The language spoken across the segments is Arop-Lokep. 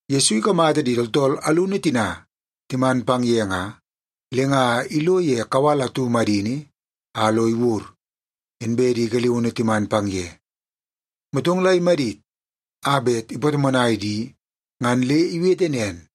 Yesu ikamata di tooltool alunu tina timan pang ye nga, le nga ilo ye kawal atu madini a lo iwur, inbe di galiunu timan pang ye. Motong la imadit a bet ipatomonai di, ngan le iwete nen,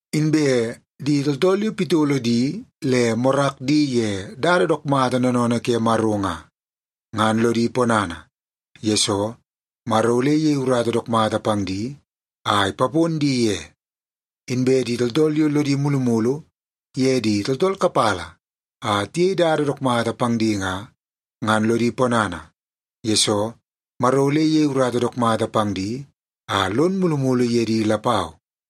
Inbe di tooltool yo pitolo di le morak di ye dada dook mata noonoonoo ke Maro nga, ngan lodi ponana, yesoo Maro ole iyei urata dook mata pang di a ipapon di ye. Inbe di tooltool yo lodi mulumulu ye di tooltool kapala a tiyei dada dook mata pang di nga, ngan lodi ponana, yesoo Maro ole iyei urata dook mata pang di a lon mulumulu ye di lapau.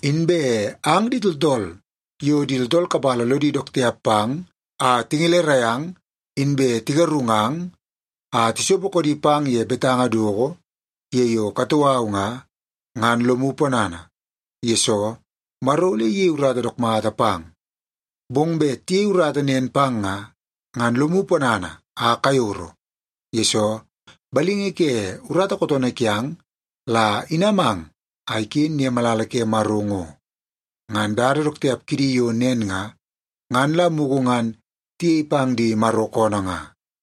“Inbe ang di tooltool yo di tooltool kapala lodi dook tiap pang a tingelerai ang inbe tigarungang a tisopo koodi pang ye betanga doko ye yo katoo au nga, ngan lomu ponana, yesoo Maro ole iyei dada dook mata pang. Bong bet tiyei urata nen pang nga, ngan lomu ponana a kayoro, yesoo balingi ke urata kootoonoo kiang la inamang a iken ye malala ke Maro ngo. Ngan dada dook tiap kidi yo nen nga, ngan la mugu ngan tiyei pang di Maro koonoo nga.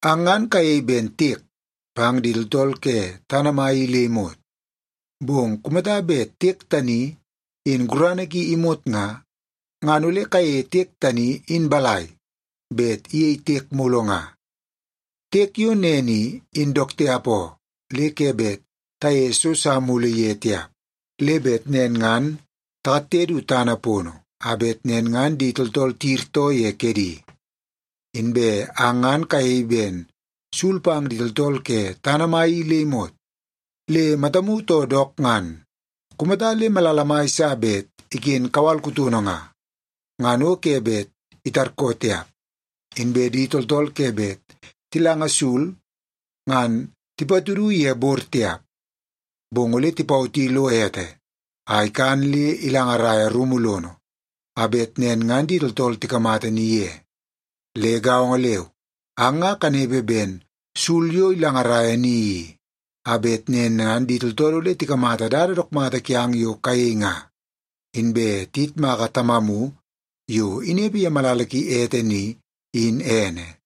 “Ang ngan kayei ben tiek pang di tooltool ke tana mai i le imot. Bong kumata bet tiek tani in gurana ki imot nga, ngan ole kayeie tiek tani in balai bet iyei tiek mulu nga? Tiek yo nen i, in dook tiap oo, le ke bet tayeie so sa mulu ye tiap. Le bet nen ngan takatte du tana pono a bet nen ngan di tooltool tiyirtoo ye kedi. “Inbe ang ngan kayei ben sul pang di tooltool ke tana mai i le imot. Le matamu too dook ngan, kumata le malala mai sa bet iken kawal kutono nga, ngan o ke bet itarkoo tiap. Inbe di tooltool ke bet tilanga sul ngan tipatudu ye bor tiap. Bong ole tipawoti lo ete a ikan le ilangaraia rumu lono, a bet nen ngan di tooltool tikamata ni ye. Le gaongo leu, ang nga kanepe ben sul yo ilangaraia ni i, a bet nen ngan di tooltool ole tikamata dada dook mata kiang yo kayei nga, inbe tiyitmaka Tamamu yo inepe ye malala ki ete ni, in ene.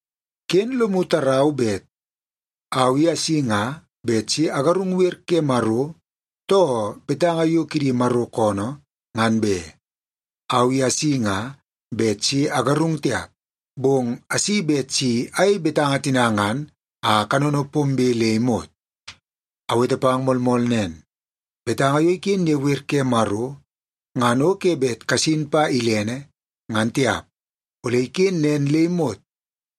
“Ken lomu tarau bet au asi nga bet si agarung wer ke Maro too betanga yo kidi Maro koonoo, ngan be. Au i asi nga bet si agarung tiap, bong asi bet si ayei betanga tina ngan a kanono pombe le imot. Awete pang moolmool nen, betanga yo iken ye wer ke Maro ngan o ke bet kasin pa bet ilene, ngan tiap. Ole iken nen le imot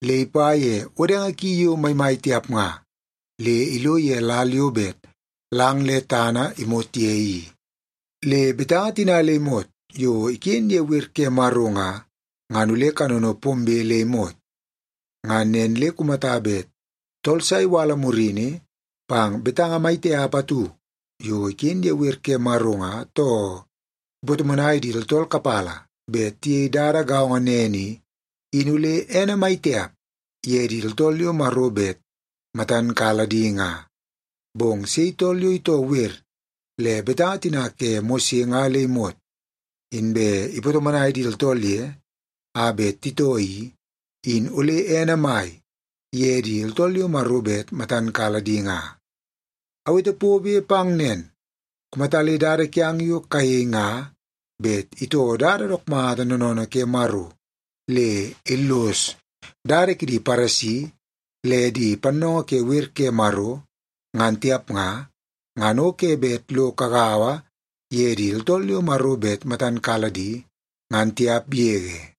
le ipa ye wodenge ki yo maimai tiap nga, le ilo ye lal yo bet lang le tana imot ye i. Le betanga tina le imot yo iken ye wer ke Maro nga, ngan ole kanono pombe le imot. Ngan nen le kumata bet tooltool sa iwala murini pang betanga mai tiap atu yo iken ye wer ke Maro nga, too ipatomonai di tooltool kapala bet tiyei dada gaongo nen i, in ole ene mai tiap ye di tooltool yo Maro bet matan kala di nga. Bong sei tool yo itoo wer le betanga tina ke Mose nga le imot, inbe ipatomonai di tooltool ye a bet titoo i, in ole ene mai ye di tooltool yo Maro bet matan kala di nga. Awete pobe pang nen, kumata le dada kiang yo kayei nga bet itoo dada dook mata noonoonoo ke Maro le illos dada kidi Paresi le di pannoongoo ke wer ke Maro, ngan tiap nga, ngan o ke bet lo kagaua ye di tooltool yo Maro bet matan kala di, ngan tiap yege.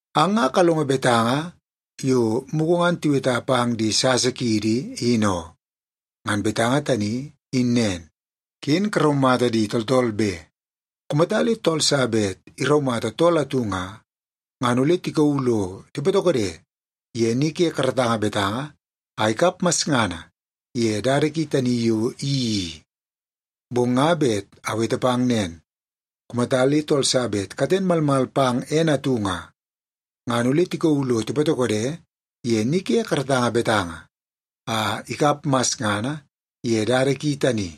“Ang nga kalongo betanga yo mugu ngan tiweta pang di sasa kiidi, in oo. Ngan betanga tani in nen, ‘Ken karaumata di tooltool be. Kumata le tool sa bet iraumata tool atu nga, ngan ole tikauu lo tipatokode ye ni ke karatanga betanga a ikap masngana ye dada ki tani yo iyeii i.’ Bong nga bet awete pang nen, kumata le tool sa bet katen malmal pang ene atu nga, ngan ole tikauu lo tipatokode ye ni ke karatanga betanga a ikap masngana ye dada ki tani.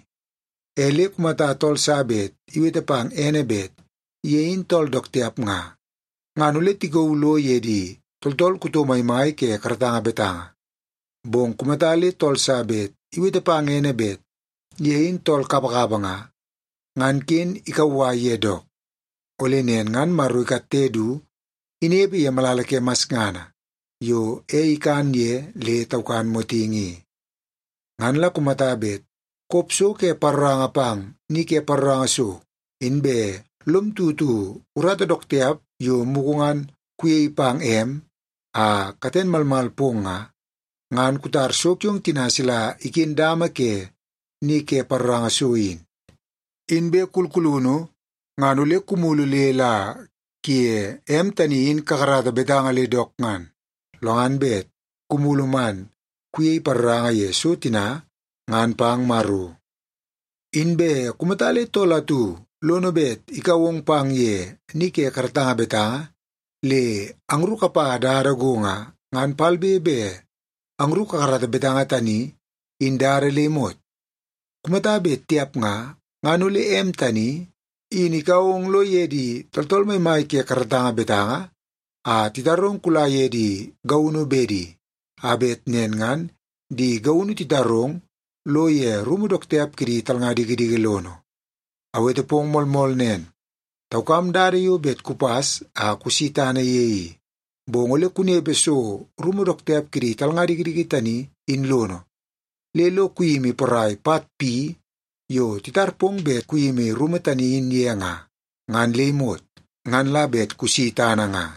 E le kumata tool sa bet iwete pang ene bet ye in tool dook tiap nga, ngan ole tikauu lo ye di tooltool kuto maimai ke karatanga betanga. Bong kumata le tool sa bet iwete pang ene bet ye in tool kapakapa nga, ngan ken ikauwai ye dook, ole nen ngan Maro ikatte du inepe ye malala ke masngana yo ei ikan ye le taukan motingi i. “Ngan la kumata bet kop so ke paroranga pang ni ke paroranga so, inbe lom tutu urata dook tiap yo mugu ngan kuyei pang em a katen malmal pong nga, ngan kutar so kiong tina sila dama ke ni ke paroranga so in. Inbe kulkulunu ngan ole kumulu le la kuye em tani in kakarata betanga le dook ngan, lo ngan bet kumulu man kuyei paroranga ye so tina ngan pang Maro. “Inbe kumata le tool atu lono bet ikau ong pang ye ni ke karatanga betanga le angru kapa dada go nga, ngan palbe be angru kakarata betanga tani in dada le imot. Kumata bet tiap nga, ngan ole em tani in ikau ong lo ye di tooltool maimai ke karatanga betanga a titarong kula ye di gaunu bedi, a bet nen ngan di gaunu titarong lo ye rumu dook tiap kidi talnga dikidiki lono. Awete pong moolmool nen, taukam dada yo bet kupas a kusi tana ye i. Bong ole kunepe so rumu dook tiap kidi talnga dikidiki tani in lono, le lo kuyimi porai pat pi yo titar pong bet kuyimi rumu tani in ye nga, ngan le imot, ngan la bet kusi tana nga.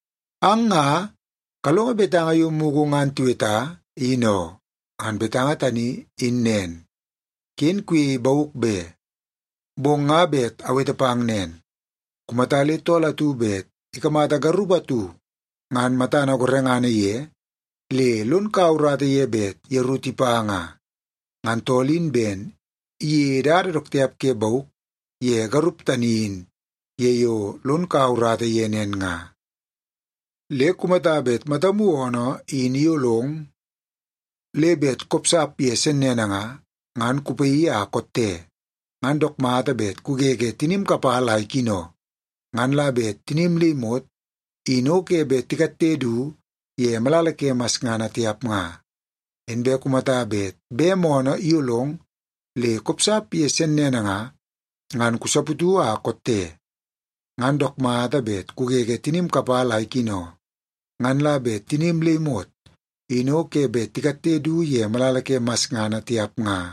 “Ang nga kalongo betanga yo mugu ngan tiweta, in oo. Ngan betanga tani in nen, ‘Ken kayei bauk be.’ Bong nga bet awete pang nen, kumata le tool atu bet ikamata garup atu ngan matana gorengana ye le lon kaua urata ye bet yeru tipa nga, ngan tool in ben iyeie dada dook tiap ke bauk ye garup tani in ye yo lon kaua urata ye nen nga. “Le kumata bet matam oonoo in iyolong le bet kopsap ye sennene nga, ngan kupaii a kotte. Ngan dook mata bet kugege tinim kapala a ikino, ngan la bet tinim le imot in o ke bet tikatte du ye malala ke masngana tiap nga. Inbe kumata bet bem oonoo iyolong le kopsap ye sennene nga, ngan kusaputu a kotte. Ngan dook mata bet kugege tinim kapala a ikino, ngan la bet tinim le imot in o ke bet tikatte du ye malala ke masngana tiap nga.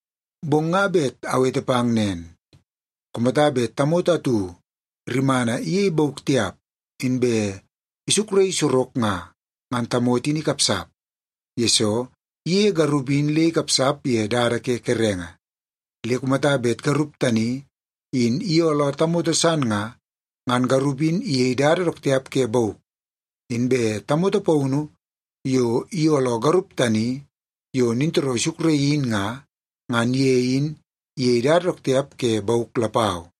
Bong nga bet awete pang nen, kumata bet tamoto atu rimana iyei bauk tiap, inbe isukraii sorok nga, ngan tamoto in ikapsap, yesoo iyeie garup in le ikapsap ye dada ke kerenge. Le kumata bet garup tani in iyooloo tamoto san nga, ngan garup in iyei dada dook tiap ke bauk. Inbe tamoto paunu yo iyooloo garup tani yo nintooroo isukraii in nga, ngan ye in iyei dada dook tiap ke bauk lapau.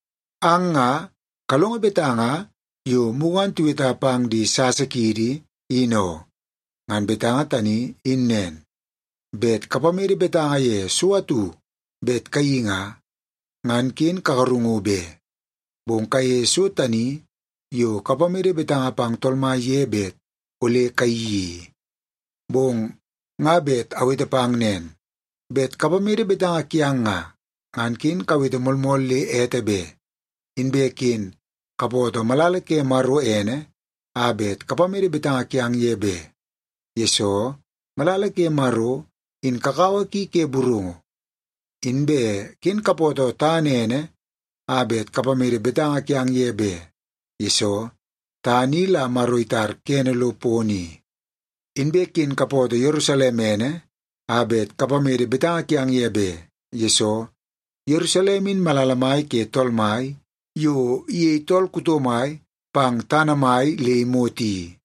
“Ang nga kalongo betanga yo mugu ngan tiweta pang di sasa kiidi, in oo. Ngan betanga tani in nen, ‘Bet kapamede betanga ye so atu bet kayeii nga, ngan ken kagarungu be. Bong kayeie so tani yo kapamede betanga pang Tool Mai ye bet ole kayeii i.’ Bong nga bet awete pang nen, bet kapamede betanga kiang nga, ngan ken kawete moolmool le ete be. Inbe ken kapootoo malala ke Maro ene a bet kapamede betanga kiang ye be, yesoo malala ke Maro in kakawa ki ke burungu. Inbe ken kapootoo tana ene a bet kapamede betanga kiang ye be, yesoo tana i la Maro itar kene lo pono i. Inbe ken kapootoo Yerusalem ene a bet kapamede betanga kiang ye be, yesoo Yerusalem in malala mai ke Tool Mai yo iyei tool kuto mai pang tana mai le imot i.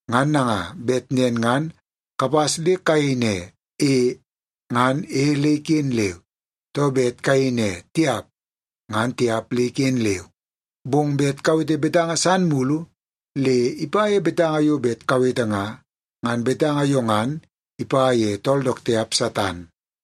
Ngan nanga, bet nen ngan kapas le kayei ne, ‘E’ ngan ‘E’ le iken leu, too bet kayei ne, ‘Tiap’ ngan ‘Tiap’ le iken leu. Bong bet kawete betanga san mulu le ipa ye betanga yo bet kawete nga, ngan betanga yo ngan ipa ye tool dook tiap Satan.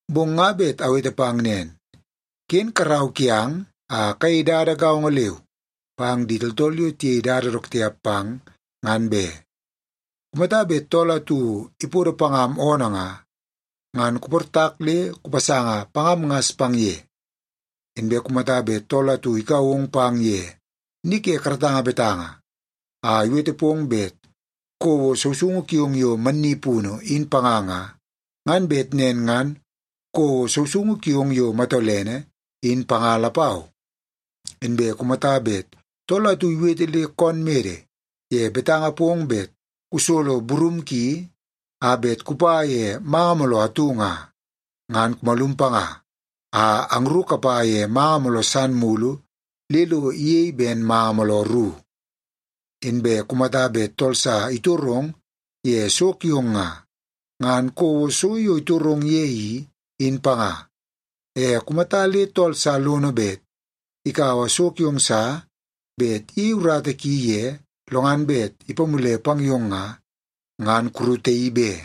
Bong nga bet awete pang nen, ken karau kiang a kayei dada gaongo leu pang di tooltool yo tiyei dada dook tiap pang, ngan be. Kumata bet tool atu ipodo pangam oonoo nga, ngan kuportak le kupasanga pangam ngas pang ye. Inbe kumata bet tool atu ikau ong pang ye ni ke karatanga betanga a iwete pong bet kouo sousoungu kiong yo mannipunu in panga nga, ngan bet nen ngan kouo sousoungu kiong yo matolene in panga lapau. Inbe kumata bet tool atu iwete le koon mede ye betanga pong bet kusolo burum ki a bet kupa ye manga mooloo atu nga, ngan kumalum panga a angru kapa ye manga mooloo san mulu le lo iyei ben manga mooloo ru. Inbe kumata bet tool sa itorong ye so kiong nga, ngan kouo so yo itorong ye i, in panga. E kumata le tool sa lono bet ikaua so kiong sa bet iyei urata ki ye lo ngan bet ipamule pang yong nga, ngan kurutaii be.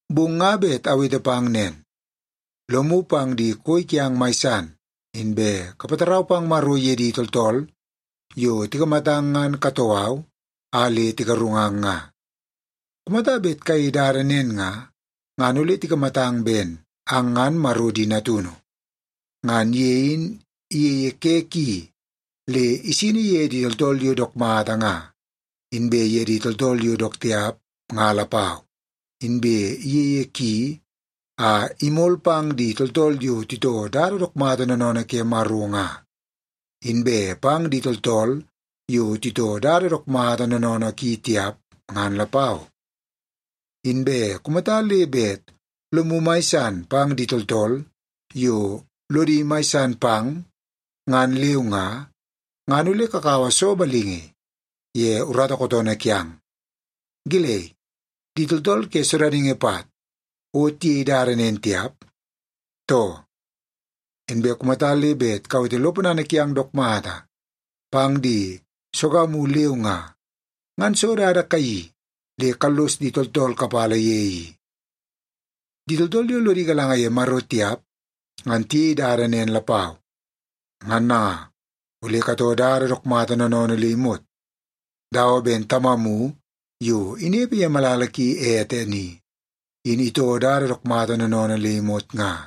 Bong nga bet awete pang nen, lomu pang di koi kiang mai san, inbe kapatarau pang Maro ye di tooltool yo tikamatang ngan katoo au a le tigarungang nga. Kumata bet kayei dada nen nga, ngan ole tikamatang ben ang ngan Maro di natunu. Ngan ye in iyeie ke ki le isini ye di tooltool yo dook mata nga, inbe ye di tooltool yo dook tiap nga lapau. Inbe iyeie ki a imol pang di tooltool yo titoo dada dook mata noonoonoo ke Maro nga, inbe pang di tooltool yo titoo dada dook mata noonoonoo ki tiap, ngan lapau. Inbe kumata le bet lomu mai san pang di tooltool yo lodi mai san pang, ngan leu nga, ngan ole kakaua soo balingi ye urata kootoonoo kiang? Gelei, di tooltool ke sodaningi pat o tiyei dada nen tiap, too? Inbe kumata le bet kawete lo ponana kiang dook mata pang di sogamu leu nga, ngan soo dada kayeii le kallos di tooltool kapala ye i? Di tooltool yo lodi galanga ye Maro tiap ngan tiyei dada nen lapau. Ngan nanga, ole katoo dada dook mata noonoonoo le imot, dawa ben Tamamu yo inepe ye malala ki ete ni, in itoo dada dook mata noonoonoo le imot nga.”